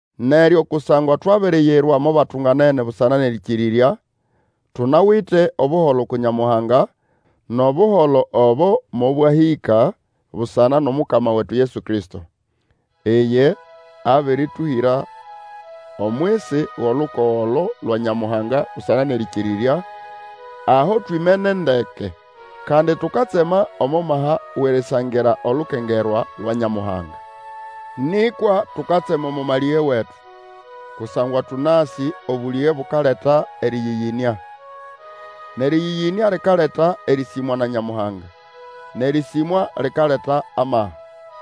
Neryo kusangwa twabiriyirwa mo batunganene busana nʼerĩkĩrĩrya, tunawite Obuholo uku Nyamuhanga, nʼobuholo obo mobwahĩka busana nʼomukama wetu Yesu Kristo. Iye abĩrĩtũhĩra omwisi wʼolukogo olo lwa Nyamuhanga busana nʼerĩkĩrĩrya, aho twimene ndeke. Kandi tukatsema omo maha wʼerisangira olukengerwa lwa Nyamuhanga. Nĩkwa tukatsema omo malĩge wetu, kusangwa tũnasĩ obũlĩge bukaleta erĩyĩyĩnĩa. Nʼerĩyĩyĩnĩa likaleta erĩsĩmwa na Nyamuhanga, nʼerĩsĩmwa likaleta amaha.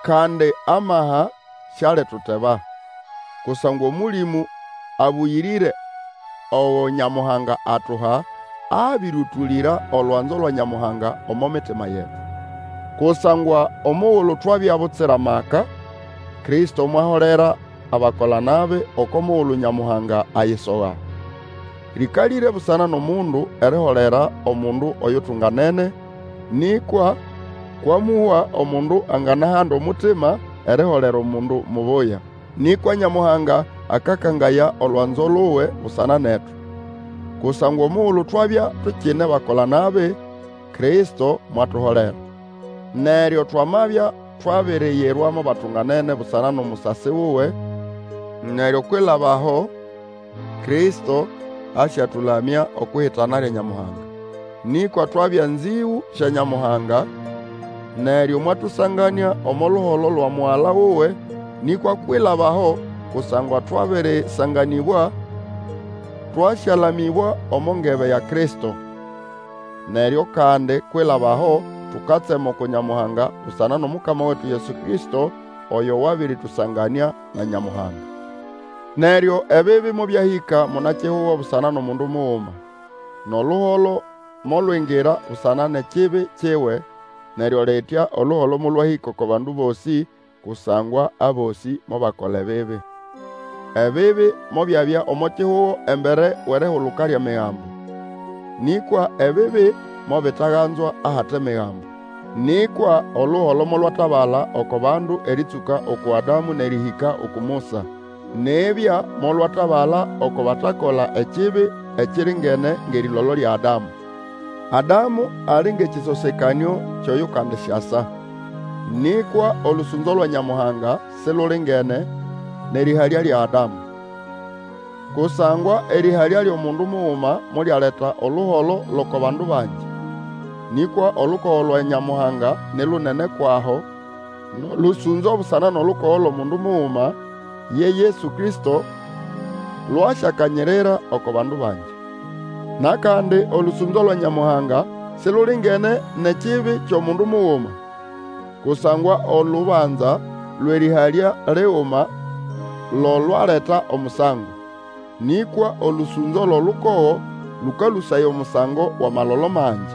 Kandi amaha sialituteba, kusangwa Omũlĩmũ Abũyĩrĩre ogo Nyamuhanga atuha, abĩrĩũtũlĩra olwanzo lwa Nyamuhanga omo mitima yetu. Kusangwa omugulu twabya butsira maka, Kristo mwaholera abakola-nabi, oko mugulu Nyamuhanga ayisoga. Lĩkalĩre busana nʼomundu eriholera omundu oyutunganene, nĩkwa, kwamũhwa omundu anganahanda omutima eriholera omundu mubuya. Nĩkwa Nyamuhanga akakangaya olwanzo luwe busana netu, kusangwa omugulu twabya tukine bakola-nabi, Kristo mwatuholera. Neryo twamabya twabiriyirwa mo batunganene busana nʼomusasi wuwe, neryo kwilaba aho, Kristo asyatũlamya okwʼihitana lya Nyamuhanga. Nĩkwa twabya nzĩgũ sya Nyamuhanga, neryo mwatũsanganĩa omo luholo lwa Mugala wuwe; nĩkwa kwilaba aho, kusangwa twabĩrĩsanganĩbwa, twasyalamĩbwa omo ngebe ya Kristo! Neryo kandi kwilaba aho, tukatsema uku Nyamuhanga busana nʼomukama wetu Yesu Kristo, oyo wabĩrĩtũsanganĩa na Nyamuhanga. Neryo ebibi mobyahĩka munakihugo busana nʼomundu muguma, nʼoluholo molwingira busana nʼekibi kiwe, neryo litya oluholo molwahĩka oko bandu bosĩ, kusangwa abosĩ mobakola ebibi. Ebibi mobyabya omo kihugo embere wʼerihuluka lyʼEmigambo; nĩkwa ebibi mobitaganzwa ahate Migambo. Nĩkwa oluholo molwatabala oko bandu erĩtsũka uku Adamu nʼerĩhĩka uku Musa; nibya molwatabala oko batakola ekibi ekiringene ngʼerĩlolo lya Adamu. Adamu ali ngʼekĩsosekanĩo kyʼoyukandisyasa. Nĩkwa olũsũnzo lwa Nyamuhanga silulingene nʼerĩhalya lya Adamu. Kusangwa erĩhalya lyʼomundu muguma molyaleta oluholo lʼoko bandu bangi. Nĩkwa olukogo lwa Nyamuhanga ni lunene kwʼaho, nʼolũsũnzo busana nʼolukogo lwʼomundu muguma, ye Yesu Kristo lwasyakanyirira oko bandu bangi. Nʼakandi olũsũnzo lwa Nyamuhanga silulingene nʼekibi kyʼomundu muguma; kusangwa olubanza lwʼerĩhalya liguma lo lwaleta omusango, nĩkwa olũsũnzo lwʼolukogo lũkalũsaya omusango wʼamalolo mangi.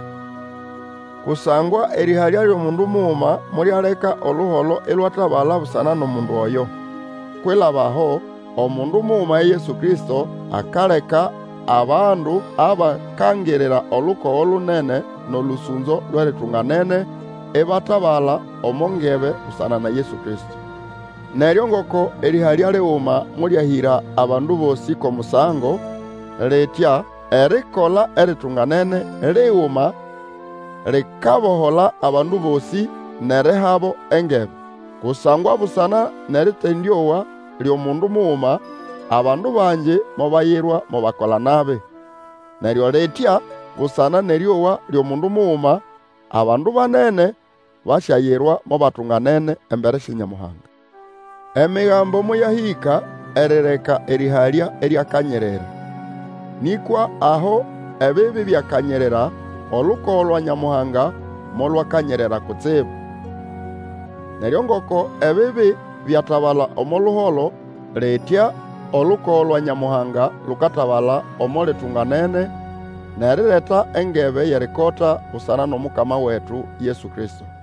Kusangwa erĩhalya lyʼomundu muguma molyaleka oluholo ilwatabala busana nʼomundu oyo; kwilaba aho, omundu muguma ye Yesu Kristo akaleka abandu abakangirira olukogo lunene nʼolũsũnzo lwʼeritunganene, ibatabala omo ngebe busana na Yesu Kristo. Neryo ngoko erĩhalya liguma molyahĩra abandu bosĩ kwʼomusango; litya erikola eritunganene liguma likabohola abandu bosĩ, nʼerihabo engebe. Kusangwa busana nʼerĩtendĩowa lyʼomundu muguma, abandu bangi mobayirwa mo bakola-nabi, neryo litya busana nʼerĩowa lyʼomundu muguma, abandu banene basyayirwa mo batunganene embere sya Nyamuhanga. Emigambo moyahĩka erireka erĩhalya iryakanyirira. Nĩkwa aho ebibi byakanyirira, olukogo lwa Nyamuhanga molwakanyirira kutsibu. Neryo ngoko ebibi byatabala omo luholo, litya olukogo lwa Nyamuhanga lukatabala omo litunganene, nʼerireta engebe yʼerikota busana nʼomukama wetu Yesu Kristo.